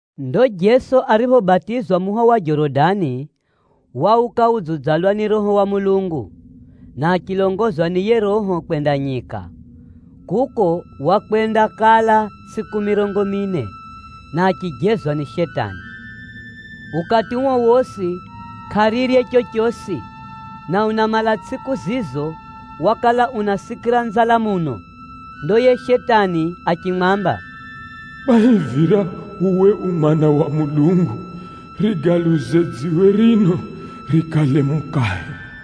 Ndo Jeso ariphobatizwa muho wa Jorodani, wauka udziudzalwa ni Roho wa Mulungu, na achilongozwa ni yiye Roho kwenda nyika. Kuko wakwendakala tsʼiku mirongo mine, na achijezwa ni Shetani. Ukati uo wosi kʼarirye chochosi, na unamala tsʼiku zizo wakala unasikira nzala muno. Ndo yiye Shetani achimwamba, “Kwahivira uwe u Mwana wa Mulungu, riambe dziwe rino rikale mukahe.”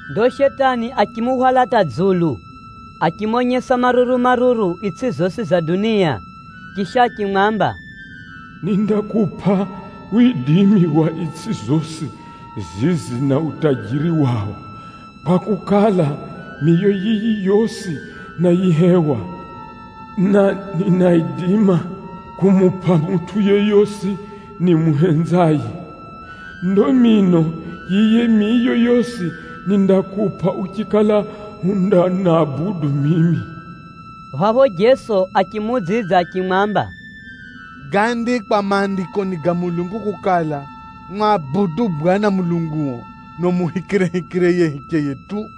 Ndo Shetani achimuhwala hata dzulu, achimonyesa maruru-maruru itsʼi zosi za dunia. Chisha achimwamba, “Nindakupʼa widimi wa itsʼi zosi zizi na utajiri wao, kwakukala, miyo yiyi yosi náyihewa, na ninaidima kumupʼa mutʼu yeyosi nimuhenzaye. Ndo mino yiyi miyo yosi nindakupʼa uchikala undanabudu mimi.” Phapho Jeso achimuudzidza achimwamba, “Gáandikwa Maandikoni ga Mulungu kukala, ‘Mwabudu Bwana Mulunguo, na umuhikirehikire yiye hicheye tu!’”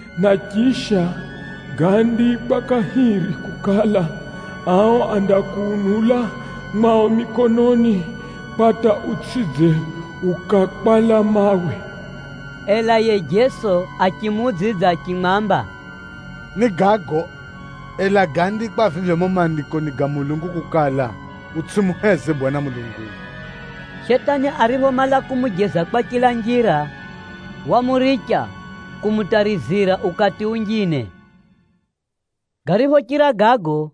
“na chisha, gaandikwa kahiri kukala, ‘Ao andakuunula na mikono yao, utsʼidze ukakwala mawe.’” Ela yiye Jeso achimuudzidza achimwamba, “Ni gago, ela gáandikwa vivyo mumo Maandikoni ga Mulungu kukala, ‘Utsʼimuheze Bwana Mulunguo.’” Shetani ariphomala kumujeza kwa chila njira, wamuricha kumutarizira ukati unjine. Gariphochira gago,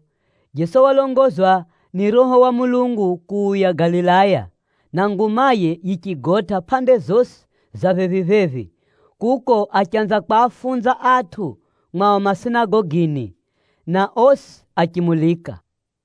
Jeso walongozwa ni Roho wa Mulungu kuuya Galilaya, na ngumaye yichigotʼa pʼande zosi za phephi-phephi. Kuko achanza kwafunza atʼu mwao masinagogini, na osi achimulika.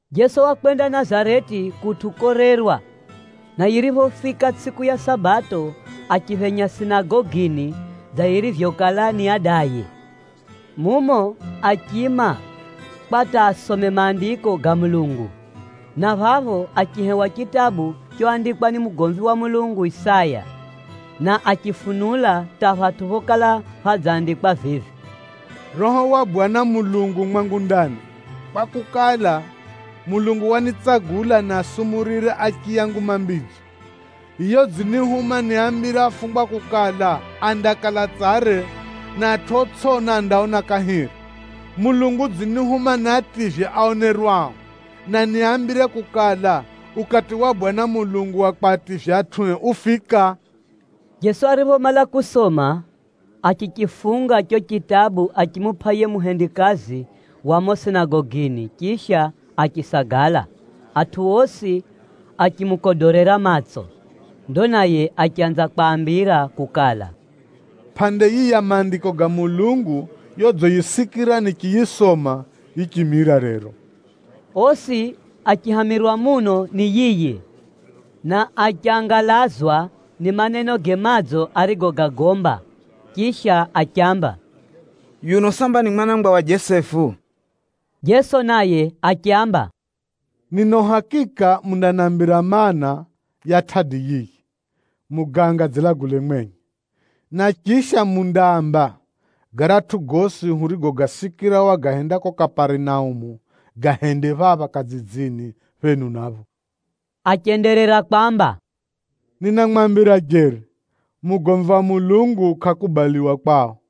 Jeso wakwenda Nazareti kutʼu korerwa, na yiriphofika tsʼiku ya Sabato achiphenya sinagogini dza yirivyokala ni adaye. Mumo achiima kwa hata asome Maandiko ga Mulungu, na phapho achihewa chitabu choandikwa ni mugomvi wa Mulungu Isaya, na achifunula hata phatʼu phokala phadzandikwa vivi: “Roho wa Bwana Mulungu u mwangu ndani, kwakukala, Mulungu wanitsagula nisumurire achiya Nguma Mbidzo. Yiye udzinihuma niaambire afungwa kukala, andakala tsare, na atʼu otsʼiona andaona kahiri. Mulungu udzinihuma niativye aonerwao, na niambire kukala, ukati ufika wa Bwana Mulungu konyesa mbazize kwa atʼue.” Jeso ariphomala kusoma, achichifunga chicho chitabu achimupʼa yiye muhendikazi wa mumo sinagogini chisha achisagala: atʼu osi achimukodorera matso. Ndo naye achanza kwaambira kukala, “Pʼande yiyi ya Maandiko ga Mulungu yodziyisikira nichiyisoma, yichimira rero.” Osi achihamirwa muno ni yiye, na achangalazwa ni manenoge madzo arigogagomba, chisha achiamba, “Yuno samba ni mwana wa Jesefu?” Jeso naye achiaamba, “Nina uhakika mundanambira maana, ya tʼadi yiyi, ‘Muganga dzilagule mwenye,’ na chisha mundaamba, ‘Garatʼu gosi hurigogasikira Wagahenda kuko Kaparinaumu, gahende phapha kadzidzini phenu napho.’” Achenderera kwamba, “Ninamwambira jeri, mugomvi wa Mulungu kʼakubaliwa kwao.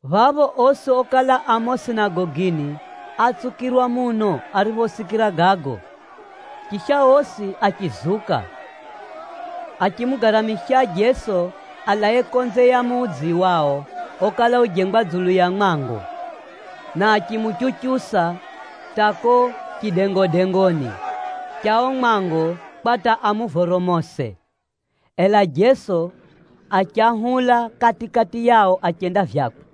Phapho osi okala a mumo sinagogini átsukirwa muno ariphosikira gago. Chisha osi achizuka, achimugaramisha Jeso alae konze ya mudzi wao okala ujengwa dzulu ya mwango, na achimuchuchusa hata kuko chidengodengoni cha uo mwango kwa hata amuvoromose. Ela Jeso achahula kati-kati yao achenda vyakwe.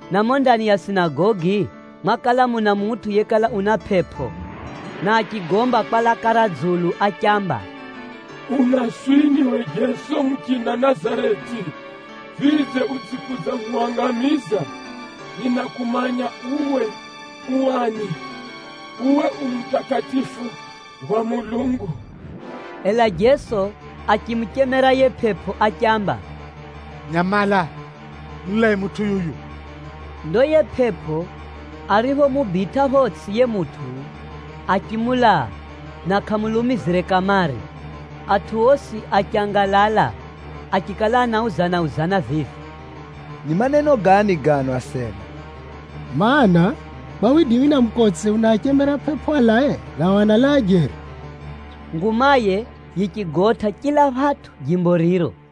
Na mumo ndani ya sinagogi mwakala muna mutʼu yekala una pʼepʼo, na achigomba kwa laka ra dzulu achiamba, “Unaswini uwe Jeso muchina Nazareti? Vidze, udzikudzahuhangamiza? Ninakumanya uwe u ani. Uwe u Mutakatifu wa Mulungu!” Ela Jeso achimuchemera yiye pʼepʼo achiamba, “Nyamala! Mulae mutʼu yuyu!” Ndo yiye pʼepʼo ariphomubitʼa photsʼi yiye mutʼu, achimulaa na kʼamulumizire kamare. Atʼu osi achangalala, achikala anauzana-uzana vivi, “Ni maneno gani gano asena! Maana, kwa widimi na mukotse unaachemera pʼepʼo alae, nao analaa jeri!” Ngumaye yichigotʼa chila phatʼu jimbo riro.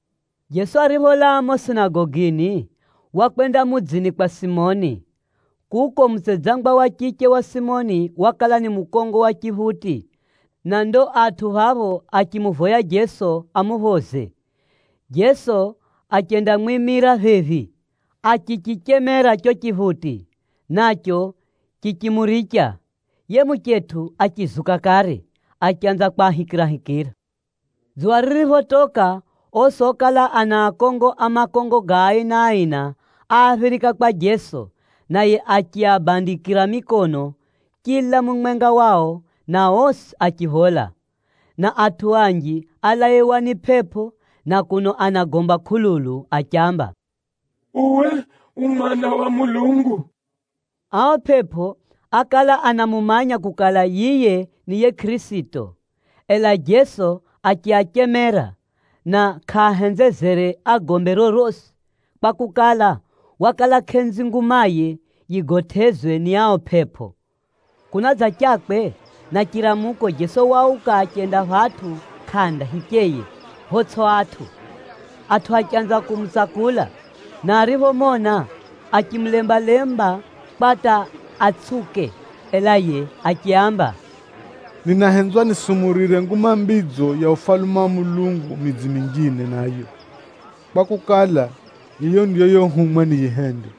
Jeso aripholaa mumo sinagogini, wakwenda mudzini kwa Simoni. Kuko mutsedzangwa wa chiche wa Simoni wakala ni mukongo wa chiphuti, na ndo atʼu phapho achimuvoya Jeso amuphoze. Jeso achendamwimira phephi, achichichemera chicho chiphuti, nacho chichimuricha. Yiye muchetʼu achizuka kare, achanza kwahikirahikira. Dzuwa ririphotoka, osi okala ana akongo a makongo ga aina-aina, áaphirika kwa Jeso, naye achiabandikira mikono chila mumwenga wao, na osi achiphola. Na atʼu anji álaiwa ni pʼepʼo, na kuno anagomba kʼululu achiamba, “Uwe u Mwana wa Mulungu!” Ao pʼepʼo ákala anamumanya kukala, yiye ni yiye Kʼirisito. Ela Jeso achiachemera, na kʼaahenzezere agombe rorosi, kwakukala, wakala kʼenzi ngumaye yigotʼezwe ni ao pʼepʼo. Kunadzachakwe na chiramuko, Jeso wauka achenda phatʼu kʼanda hicheye photsʼi atʼu. Atʼu achanza kumutsakula, na ariphomona achikulemba-lemba kwa hata atsʼiuke. Ela yiye achiaamba, “Ninahenzwa nisumurire Nguma Mbidzo ya Ufalume wa Mulungu midzi minjine nayo, kwakukala, yiyo ndiyo yohumwa niyihende.”